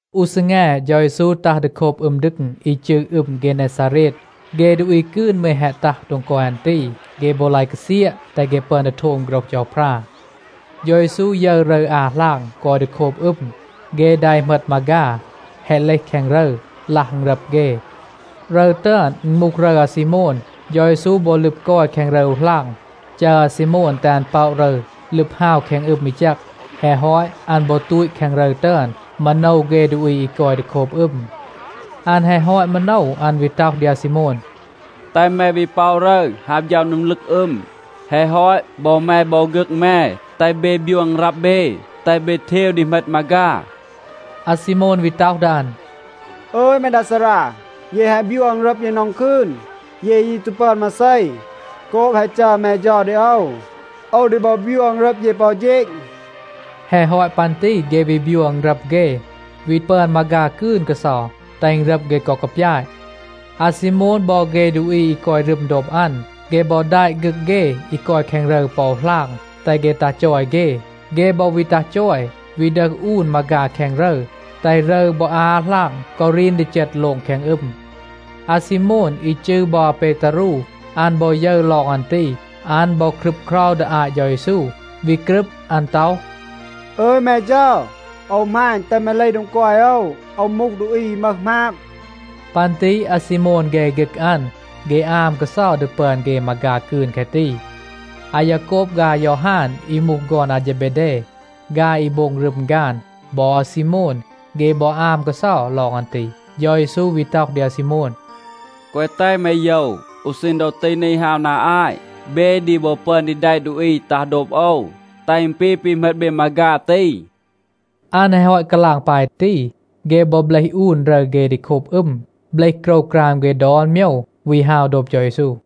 อู ซีแง, เฌา เยซู ตัห ดี โคบ อึม ดึง อี จืร อึม เกเนซาเรด.a เฆ ดูอี กืน มืร แฮะ ตัห โดง กอย อัน ตี. เฆ บอ ลาย กาเซียะ, แตห เฆ ปึอน ดี โทม โฆรห เฌาพรา. เฌา เยซู ยึร รึร อา หลาง กอย ดี โคบ อึม. เฆ ดา อี เหมต มาฆา, แฮะ เลห แคง รึร, ลัห อึณรับ เฆ. รึร ตึอน, อึณ มูห รึร อาซีโมน. เฌา เยซู บอ ลึบ กอย แคง รึร อู หลาง, จัร อาซีโมน, แตห อัน ป็อะ รึร, ลึบ ฮาว แคง อึม อี แจก. แฮะ ฮอต, อัน บอ ตูต แคง รึร ตึอน, มาโนว เฆ ดูอี อี กอย ดี โคบ อึม. อัน แฮะ ฮอต มาโนว, อัน วี ต็อห ดี อาซีโมน, “แตห แม วี ป็อะ รึร, ฮาว ฌัม โดง ลึก อึม. แฮะ ฮอต, บอ แม บอ ฆึก แม, แตห เบ บยัว อึณรับ เบ, แตห เบ เทว ดี เหมต มาฆา.” อาซีโมน วี ต็อห ดี อัน, “อึย แม ดา ซารา, เย แฮะ บยัว อึณรับ เย นอง คืน, เย ยี ตู ปึอน มาเซ. โกบ แฮะ จัร แม เฌา ดี โอว, โอว ดี บอ บยัว อึณรับ เย ปอ อู เฌณ.” แฮะ ฮอต ปัน ตี เฆ วี บยัว อึณรับ เฆ, วี ปึอน มาฆา กืน กาเซา, แตห อึณรับ เฆ กอ กาปยาต. อาซีโมน บอ เฆ ดูอี อี กอย รึม โดบ อัน, เฆ บอ แดะ ฆึก เฆ อี กอย แคง รึร ปอ อู หลาง, แตห เฆ ตัห จอย เฆ. เฆ บอ วี ตัห จอย, วี ดึห อูน มาฆา แคง รึร, แตห รึร บอ อา หลาง กอ รีน ดี เจต โลง แคง อึม. อาซีโมน, อี จืร บอ อาเปตารู, อัน บอ ยึร ลอง อัน ตี, อัน บอ ครึบเครา ดี อาต เฌา เยซู, วี กรึบ อัน ต็อห, “อึย, แม เฌา, โอว หมาณ, แตห แม เลห โดง กอย โอว. โอว มูห ดูอี อี มึห หมาบ.” ปัน ตี อาซีโมน เฆ ฆึก อัน, เฆ อาม กาเซา ดี ปึอน เฆ มาฆา กืน แคะ ตี. อายาโกบ ฆาย อายอฮาน, อี มูห ฆอน อาเฌเบเด, ฆาย อี โบง รึม ฆาน, บอ อาซีโมน, เฆ บอ อาม กาเซา ลอง อัน ตี. เฌา เยซู วี ต็อห ดี อาซีโมน, “แกวะ แตห แม โยว. อู ซีณ ดอ ตี นี ฮาว นา อาต, เบ ดี บอ ปึอน ดี แดะ ดูอี ตัห โดบ โอว, แตห อึณ ปี ปี เหมต เบ มาฆา ตี.” อัน แฮะ ฮอต กาลาง ปาย ตี, เฆ บอ เบลห อูน รึร เฆ ดี โคบ อึม, เบลห โกรวกราม เฆ ดอน โมยว, วี ฮาว โดบ เฌา เยซู.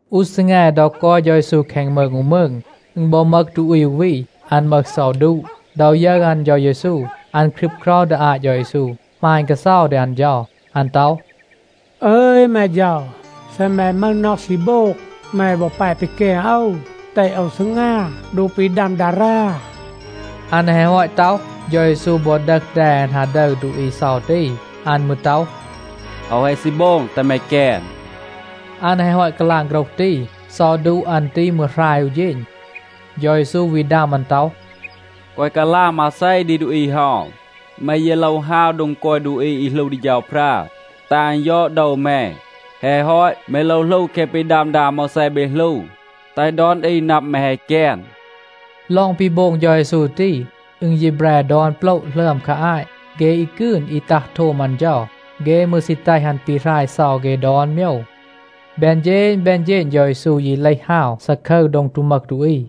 อู ซีแง ดอ กอย เฌา เยซู แคง มืง อู มืง, อึณ บอ มึห ดูอี อู วี, อัน มึห เซา ดูะ.b ดอ ยึร อัน เฌา เยซู, อัน ครึบเครา ดี อาต เฌา เยซู, หมาณ กาเซา ดี อัน เฌา. อัน ต็อห, “อึย แม เฌา, เซ แม มึห น็อห ซี โบง, แม บอ แป ปีแกน โอว, แตห โอว ซีงา โดบ ปี ดัม ดารา.” อัน แฮะ ฮอต ต็อห, เฌา เยซู บอ ดึห แด อัน ฮา ดึร ดูอี เซา ตี. อัน มืร ต็อห, “โอว แฮะ ซี โบง. แตห แม แกน.” อัน แฮะ ฮอต กาลาง โฆรห ตี, เซา ดูะ อัน ตี มืร หราย อู เฌณ. เฌา เยซู วี ดัม อัน ต็อห, “แกวะ กาลาง มาเซ ดี ดูอี เฮา. แม ยี โลว ฮาว โดง กอย ดูอี อี หลู ดี เฌาพรา, แตห อัน ยอด โดว แม. แฮะ ฮอต, แม โลว หลู แคะ ปี ดัม ดา อาโมวแซ เบ หลู, แตห ดอน อี นับ, แม แฮะ แกน.” ลอง ปี โบง เฌา เยซู ตี, อึณ ยี แบร ดอน โปละ หลึอม คา อาต. เฆ อี กืน อี ตัห โทม อัน เฌา, เฆ มืร ซี แตห อัน ปีหราย เซา เฆ ดอน โมยว. แบน เฌณ แบน เฌณ เฌา เยซู ยี เลห ฮาว ซาคึร โดง ตู มึห ดูอี.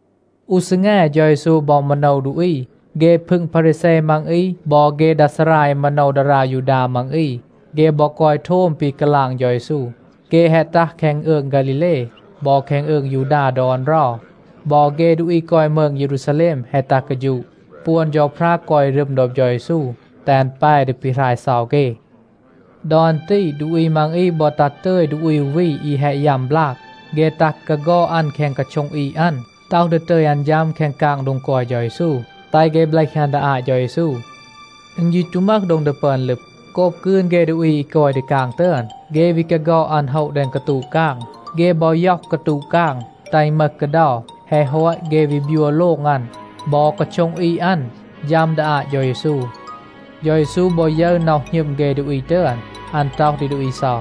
อู ซีแง เฌา เยซู บอ มาโนว ดูอี. เฆ พึง พารีแซ มัง อี บอ เฆ ดา ซารา อี มาโนว ดารา ยูดา มัง อี, เฆ บอ กอย โทม ปี กาลาง เฌา เยซู. เฆ แฮะ ตัห แคง อืง ฆาลีเล บอ แคง อืง ยูดา ดอน เรา. บอ เฆ ดูอี กอย มืง เยรูซาแลม แฮะ ตัห กาฌูะ. ปวน เฌาพรา กอย รึม โดบ เฌา เยซู แตห อัน แป ดี ปีหราย เซา เฆ. ดอ อัน ตี ดูอี มัง อี บอ ตัห ตึย ดูอี อู วี อี แฮะ ยัม บลาก. เฆ ตัห กาฆอด อัน แดง กาโช็ง อีด อัน, ต็อห ดี ตึย อัน ฌัม แคง กาง โดง กอย เฌา เยซู, แตห เฆ เบลห อัน ดี อาต เฌา เยซู. อึณ ยี ตู มึห โดง ดี ปึอน ลึบ, โกบ กืน เฆ ดูอี อี กอย ดี กาง ตึอน. เฆ วี กาฆอด อัน โฮะ แดง กาตูะ กาง. เฆ บอ ย็อห กาตูะ กาง, แตห อึณ มึห กาเดา. แฮะ ฮอต, เฆ วี บยัว โลง อัน บอ กาโช็ง อีด อัน, ฌัม ดี อาต เฌา เยซู.c เฌา เยซู บอ ยึร น็อห หณึม เฆ ดูอี ตึอน, อัน ต็อห ดี ดูอี เซา,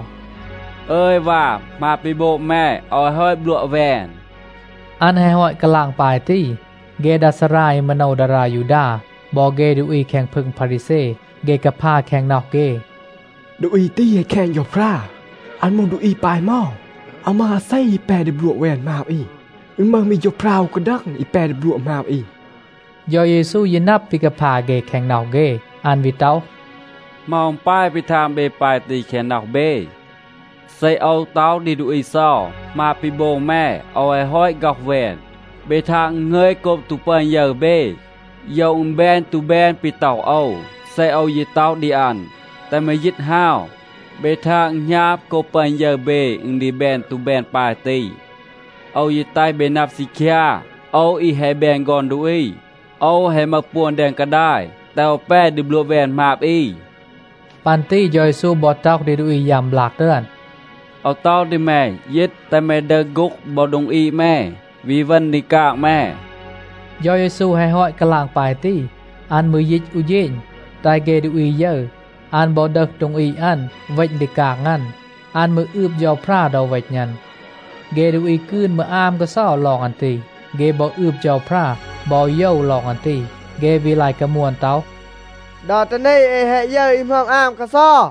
“อึย วา, หมาบ ปี โบง แม, โอว แฮะ ฮอต บลัวะ แวน.” อัน แฮะ ฮอต กาลาง ปาย ตี, เฆ ดา ซารา อี มาโนว ดารา ยูดา บอ เฆ ดูอี แคง พึง พารีแซ, เฆ กาพา แคง น็อห เฆ, “ดูอี ตี แฮะ แคณ เฌาพรา. อัน มูห ดูอี ปาย เหมา? อาว มึห อาเซ อี แป ดี บลัวะ แวน หมาบ อี. อึณ มึห มี เฌาพรา อู กาดัง อี แป ดี บลัวะ หมาบ อี.” เฌา เยซู ยี นับ ปี กาพา เฆ แคง น็อห เฆ. อัน วี ต็อห, “เหมา อึณ ปาย ปี ทาง เบ ปาย ตี แคง น็อห เบ? เซ โอว ต็อห ดี ดูอี เซา, ‘หมาบ ปี โบง แม, โอว แฮะ ฮอต ฆ็อห แวน,’ เบ ทาง อึณ หงึย โกบ ตู ปึอน ยึร เบ, โยว อึณ แบน ตู แบน ปี ต็อห โอว. เซ โอว ยี ต็อห ดี อัน, ‘แตห แม ยีต ฮาว,’ เบ ทาง อึณ หณาบ โกบ ปึอน ยึร เบ อึณ ดี แบน ตู แบน ปาย ตี. โอว ยี แตห เบ นับ ซีคยา, โอว อี แฮะ แบน ฆอน ดูอี, โอว แฮะ มึห ปวน แดง กาดาย, แตห โอว แป ดี บลัวะ แวน หมาบ อี.” ปัน ตี เฌา เยซู บอ ต็อห ดี ดูอี ยัม บลาก ตึอน, “โอว ต็อห ดี แม, ยีต, แตห แม ดึห โฆ็ง บอ โดง อีด แม, วี เวณ ดี กาง แม.” เฌา เยซู แฮะ ฮอต กาลาง ปาย ตี, อัน มืร ยีต อู เฌณ, แตห เฆ ดูอี ยึร. อัน บอ ดึห โดง อีด อัน, เวณ ดี กาง อัน. อัน มืร อืบ เฌาพรา ดอ เวณ อัน. เฆ ดูอี กืน มืร อาม กาเซา ลอง อัน ตี. เฆ บอ อืบ เฌาพรา บอ โยว ลอง อัน ตี. เฆ วี ลาย กามวน ต็อห, “ดอ ตี นี เอ แฮะ ยึร อี หมึอม อาม กาเซา.”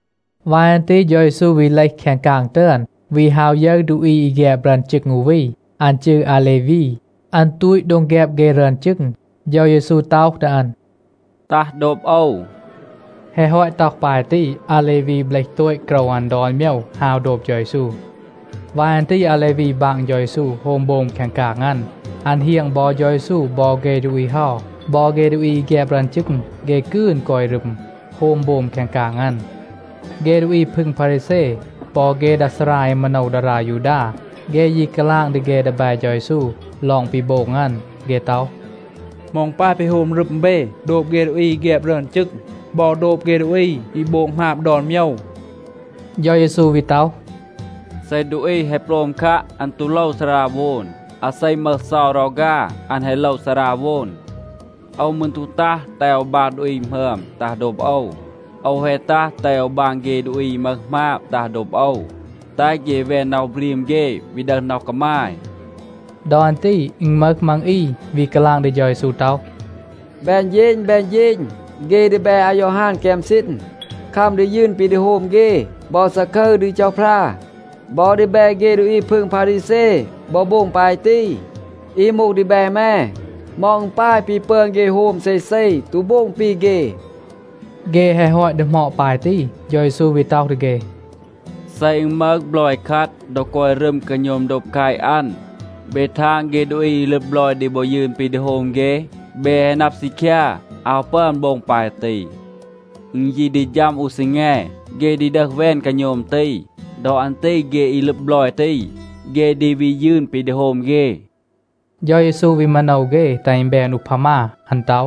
วาย อัน ตี เฌา เยซู วี เลห แคง กาง ตึอน, วี ฮาว ยึร ดูอี อี แฆบ รึอน จึง อู วี. อัน จืร อาเลวี. อัน ตูต โดง แฆบ เฆ รึอน จึง. เฌา เยซู ต็อห ดี อัน, “ตัห โดบ โอว.” แฮะ ฮอต ต็อห ปาย ตี, อาเลวี เบลห โตต โกรว อัน ดอน โมยว, ฮาว โดบ เฌา เยซู. วาย อัน ตี อาเลวี บาง เฌา เยซู โฮม โบม แคง กาง อัน. อัน เฮียง บอ เฌา เยซู บอ เฆ ดูอี เฮา. บอ เฆ ดูอี อี แฆบ รึอน จึง, เฆ กืน กอย รึม, โฮม โบม แคง กาง อัน. เฆ ดูอี พึง พารีแซ บอ เฆ ดา ซารา อี มาโนว ดารา ยูดา, เฆ ยี กาลาง ดี เฆ ดีแบ เฌา เยซู ลอง ปี โบง อัน. เฆ ต็อห, “เหมา อึณ ปาย ปี โฮม รึม เบ โดบ เฆ ดูอี อี แฆบ รึอน จึง บอ โดบ เฆ ดูอี อี โบง หมาบ ดอน โมยว?” เฌา เยซู วี ต็อห, “เซ ดูอี แฮะ โปลม คัะ, อัน ตู โลว ซาราโวน. อาเซ มึห เซา รอฆา, อัน แฮะ โลว ซาราโวน. โอว มืร ตู ตัห แตห โอว บาง ดูอี หมึอม ตัห โดบ โอว. โอว แฮะ ตัห แตห โอว บาง เฆ ดูอี อี มึห หมาบ ตัห โดบ โอว, แตห เฆ แวน น็อห บรีม เฆ, วี ดึห น็อห กามาย.” ดอ อัน ตี อึณ มึห มัง อี วี กาลาง ดี เฌา เยซู ต็อห, “แบน เฌณ แบน เฌณ, เฆ ดีแบ อายอฮาน แกม ซีณ, คัม ดี ยืน ปี ดี โฮม เฆ บอ ซาคึร ดี เฌาพรา. บอ ดีแบ เฆ ดูอี พึง พารีแซ บอ โบง ปาย ตี. อี มูห ดีแบ แม, เหมา อึณ ปาย ปี ปึอน เฆ โฮม เซเซ, ตู โบง ปี เฆ?” เฆ แฮะ ฮอต ดีหมอด ปาย ตี, เฌา เยซู วี ต็อห ดี เฆ, “เซ อึณ มึห บลอย คัด, ดอ กอย รึม กาโณม โดบ แคต อัน, เบ ทาง เฆ ดูอี อี ลึบ บลอย ดี บอ ยืน ปี โฮม เฆ? เบ แฮะ นับ ซีคยา, อาว ปึอน โบง ปาย ตี. อึณ ยี ดี ฌัม อู ซีแง, เฆ ดี ดึห แวน กาโณม ตี. ดอ อัน ตี เฆ อี ลึบ บลอย ตี, เฆ ดี วี ยืน ปี ดี โฮม เฆ.” เฌา เยซู วี มาโนว เฆ, แตห อึณ แบน อูพามา. อัน ต็อห,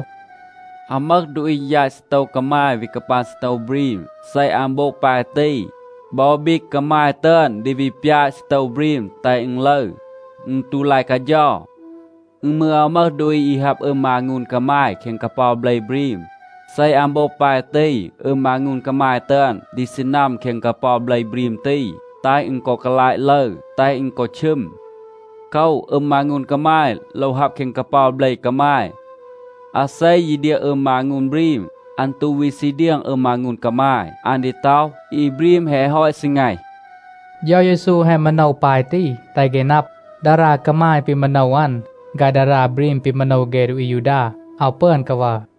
“อาว มึห ดูอี ยาต ซีโตว กามาย วี กาปาง ซีโตว บรีม. เซ อัน โบง ปาย ตี, บอ บีก กามาย ตึอน ดี วี ปยาต ซีโตว บรีม แตห อึณ ลึร. อึณ ตู ลาย กาเฌา. อึณ มืร อาว มึห ดูอี อี ฮับ อึม มางูน กามาย แคง กาเปา เบล บรีม. เซ อัน โบง ปาย ตี, อึม มางูน กามาย ตึอน ดี ซีนัม แคง กาเปา เบล บรีม ตี, แตห อึณ กอ กาลาต ลึร, แตห อึณ กอ ชึม. โคว, อึม มางูน กามาย โลว ฮับ แคง กาเปา เบล กามาย. อาเซ ยี เดียง อึม มางูน บรีม, อัน ตู วี ซี เดียง อึม มางูน กามาย. อัน ดี ต็อห, ‘อี บรีม แฮะ ฮอต ซีแงห.’” เฌา เยซู แฮะ มาโนว ปาย ตี แตห เฆ นับ, ดารา กามาย ปี มาโนว อัน ฆาย ดารา บรีม ปี มาโนว เฆ ดูอี อายูดา, อาว ปึอน กาวัร.